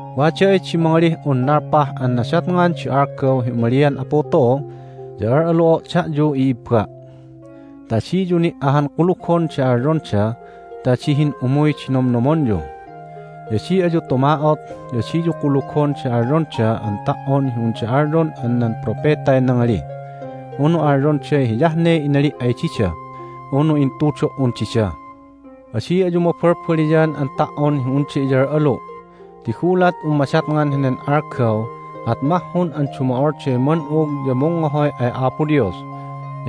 Wada ay di mangalih un nalpah an nadatngan di algaw hi umalian Apu tu'u ya al'alu'o' da'yu, i'ibba', ta adiyu ni' ahan kulugon di alyonda ta adi hin'umuy di nomnomonyu. Ya adi ayu tuma'ot, ya adiyu kulugon di alyonda an ta"on hi unda alyon an nan propetay nangali, unu alyonday hiyah ne inali' ay dida, unu intudo"un dida. Adi ayu mabalbaliyan an ta"on hi unda iyal'alu'. Ti gulat un madatngan henen algaw at mahhun an dumo'olday man'ug ya mungngohoy ay Apo Dios,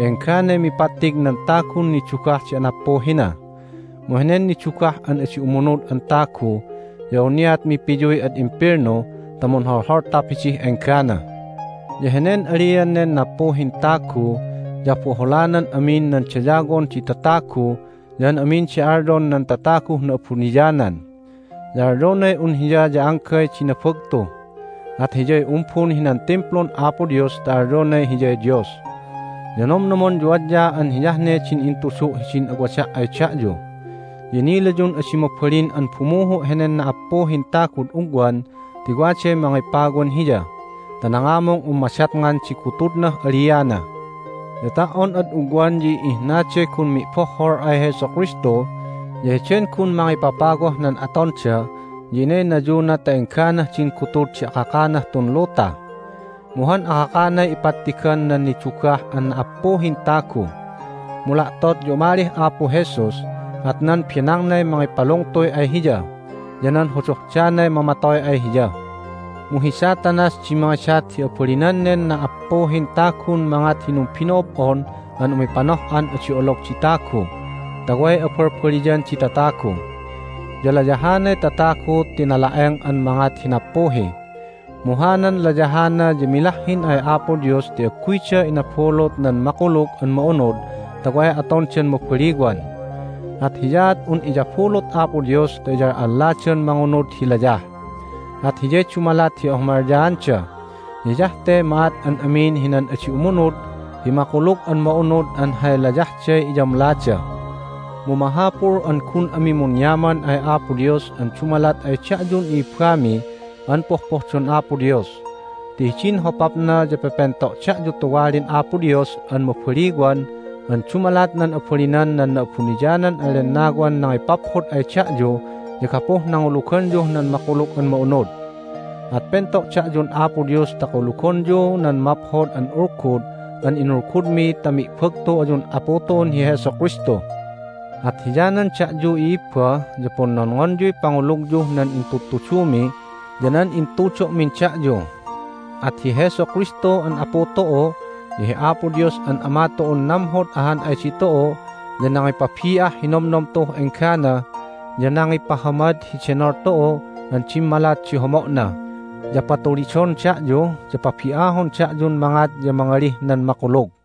ya engganay mipattig nan tagun nidugah di anappuhina. Mu henen nidugah an adi umunud an tagu ya awniat mipiyuy ad imbelnu ta munholholtap hidih enggana. Ya henen alian nen nappuhin tagu ya aboholanan amin nan dayawon di tatagu ya an amin di alyon nan tataguh na'abuniyanan. Ya alyonay un hiya ya anggay di nabagtu, at hiyay umbun hinan Timplun Apo Dios ta alyonay hiyay Dios! Ya nomnomonyu adya an hiyah ne din intudu' hidin awada' ay da'yu! Ya inilayun adi mabalin an bumuhu' henen na"appuhin tagud ugwan ti waday Mangipawan hiya ta nangamung un madatngan di gutudnah aliana. Ya ta"on ad ugwan ya i"ihnaday gun mi'bohhol ay Jesu Kristu, ya heden gun Mangipapawah nan atonda ya inaynayuna ta engganah din gutud di akakanah tun luta. Mu han akakanay ipattigan nan nidugah an na"appuhin tagu. Mu la'tot ya umalih Apu Jesus, at nan benangnay mangipalungtuy ay hiya, ya nan hodohdanay mamatoy ay hiya. Mu hi Satanas di mangidat hi abalinan nen na"appuhin tagun mangat hi numbino'ob'on an umipanoh'an adi olog di tagu ta way abalbaliyan di tatagu, ya layahanay tatagu ti nala'eng an mangat hi nappuhi. Mu hanan layahana ya milahhin ay Apo Dios ti agguyda inabulut nan Makulug an Ma'unud ta way atondan mabaliwan. At hiyaat un iyabulut Apo Dios ta iyal'alladan mangunud hi layah, at hiyay dumalat hi ahumalyaanda, ya hiyah te ma'at an amin hinan adi umunud hi Makulug an Ma'unud an hay layahday iyamlada. Mu mahapul an gun ami munyaman ay Apo Dios an dumalat ay da'yun i'ibbami an pohpohdon Apo Dios. Ti hidin hopapna ya pepento' da'yu tuwalin Apo Dios an mabaliwan an dumalat nan abalinan nan Na'abuniyanan an Lennawan nangipaphod ay da'yu ya gapuh nanguluganyuh nan Makulug an Ma'unud. At pento' da'yun Apo Dios ta kulugonyu nan Maphod an Ulgud an inulgudmi ta mi'bagtu ayun Apu tu'un hi Jesu Kristu. At hiyanan da'yu, i'ibba, ya punnonngonyuy pangulugyuh nan intudtudumi ya nan intudo'min da'yu. At hi Jesu Kristu an Apu tu'u ya hi Apo Dios an Ama tu'un namhod ahan ay ditu'u ya nangipabi'ah hi nomnom tu'uh enggana, ya nangipahamad hi denol tu'u an dimmalat di homo'na, ya patulidon da'yu, ya pabi'ahon da'yun mangat ya mangalih nan makulug.